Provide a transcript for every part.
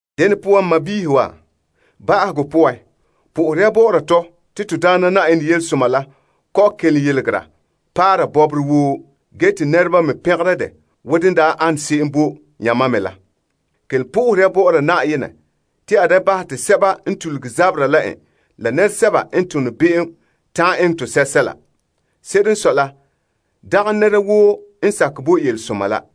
Dene poan n sɔɔnrɔ wa, ba'ahegɔ poan, po'ohere ya bɔ'ɔra tɔ te Na'ayenɛ Yelesoma la kɔ'ɔn kelom yeregera paara bɔbɔre woo ge te nɛreba me pɛngera dɛ wo dene daa an se'em bo yamam me la. Kelom po'ohere ya bɔ'ɔra Na'ayenɛ te a da bahɛ te sɛba n tuluge zabera la en, la nɛresɛba n tone be'em ta'an eŋɛ tɔ sɛla. Se'ere n sɔe la, dagɛ nɛra woo n sakɛ bo Yelesoma la.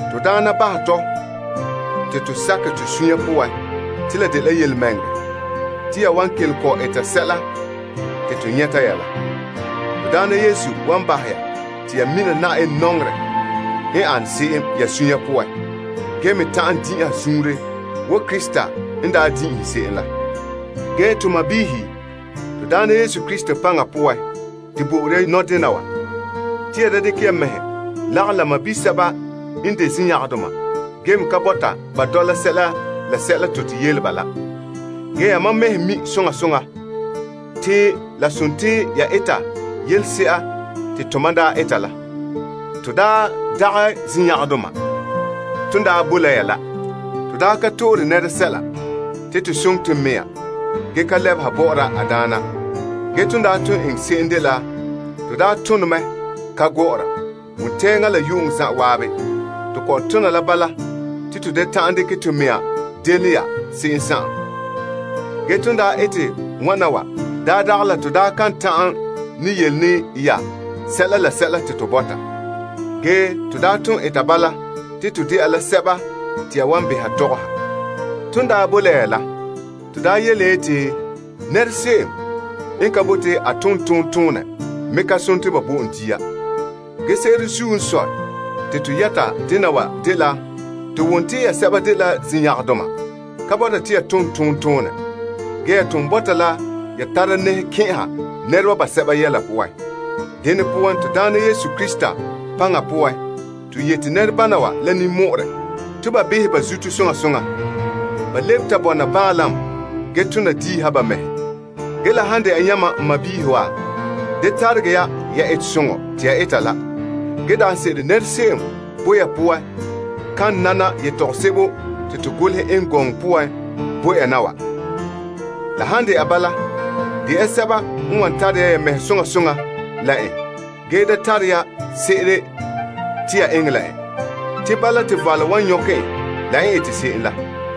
Na'ayenɛ bahɛ tɔ te to sakɛ to sunya poan te la dela yelemɛŋɛrɛ te ya wan kelom kɔ'ɔn eta sɛla te to yɛta ya la. Na'ayenɛ wan bahɛ ya te ya mina Yenɛ nɔŋerɛ n an se'em ya suunre poan ge me ta'ana din'inha suunre wo Krista n daa din'inhe se'em la. Ge to sɔɔnrɔ, Na'ayenɛ Yesu Krista paŋa poan, to bo'ore ya nɔdena wa, te ya da dekɛ ya mɛhe lagom la sɔɔn sɛba n de zinyangarɛdoma ge me ka bɔta ba dɔla sɛla te to yele ba la. Ge yamam mɛhe mi' soŋa soŋa te la dela ya eta yelese'a te tomam daa eta la. To daa dagɛ zinyangarɛdoma ton daa boe la ya la. To daa ka dite nɛra dia ge ka yɔɔra. To daa ton eŋɛ se'em dela to daa tone mɛ ka gɔ'ɔra. Wontɛɛŋa la yu'uŋɔ zan'an, to kɔ'ɔn tona la bala te to da ta'an dekɛ to mɛŋa delom ya se'em. Ge ton daa ete wana wa daa dagɛ la to daa kan ta'an ne yele ne ya sɛla la sɛla te to bɔta. Ge, to daa ton eta bala te to dɛna la sɛba te ya wan beha tɔgɔha. Ton daa bo la ya la, to daa yele ya yeti, Nɛra se'em n ka bote a tooma a dagɛ ba bo en dia. Ge se'ere zuo n sɔe te to yɛta dena wa dela to wom te ya sɛba dela zinyangarɛdoma ka bɔta te ya tom tontonɛ. Ge, ya ton bɔta la ya tara nɛhe kɛn'ɛha nɛreba basɛba yɛla poan. Dene poan, Na'ayenɛ Yesu Krista paŋa poan, to yete nɛrebana wa la ninmɔ'ɔrɛ te ba behɛ ba zuto soŋa soŋa. Ba lebe ta bɔna baanlam ge tona diiha ba mɛhe. Ge la han dɛna la yamam n sɔɔnrɔ wa, da taregɛ ya ya etesoŋɔ te ya eta la. Ge daanse'ere nɛra se'em boe ya poan kan nana yetɔgom sebo te to golehɛ eŋɛ gɔŋɔ poan bo ya na wa. La han de'a bala, de ya sɛba n wan tara ya mɛhe soŋa soŋa la en ge da tare ya se'ere te ya eŋɛ la en. Te bala te valom wan nyɔkɛ en la n ete se'em la.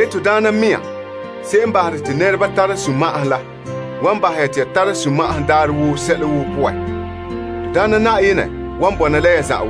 Na'ayenɛ mɛŋa se'em n bahere te nɛreba tara sunma'ahom la wan bahɛ ya te ya tara sunma'ahom daarɛ woo sɛla woo poan. Na'ayenɛ wan bɔna la ya zan'an.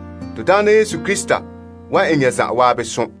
To Na'ayenɛ Yesu Krista wan eŋɛ ya zan'an som.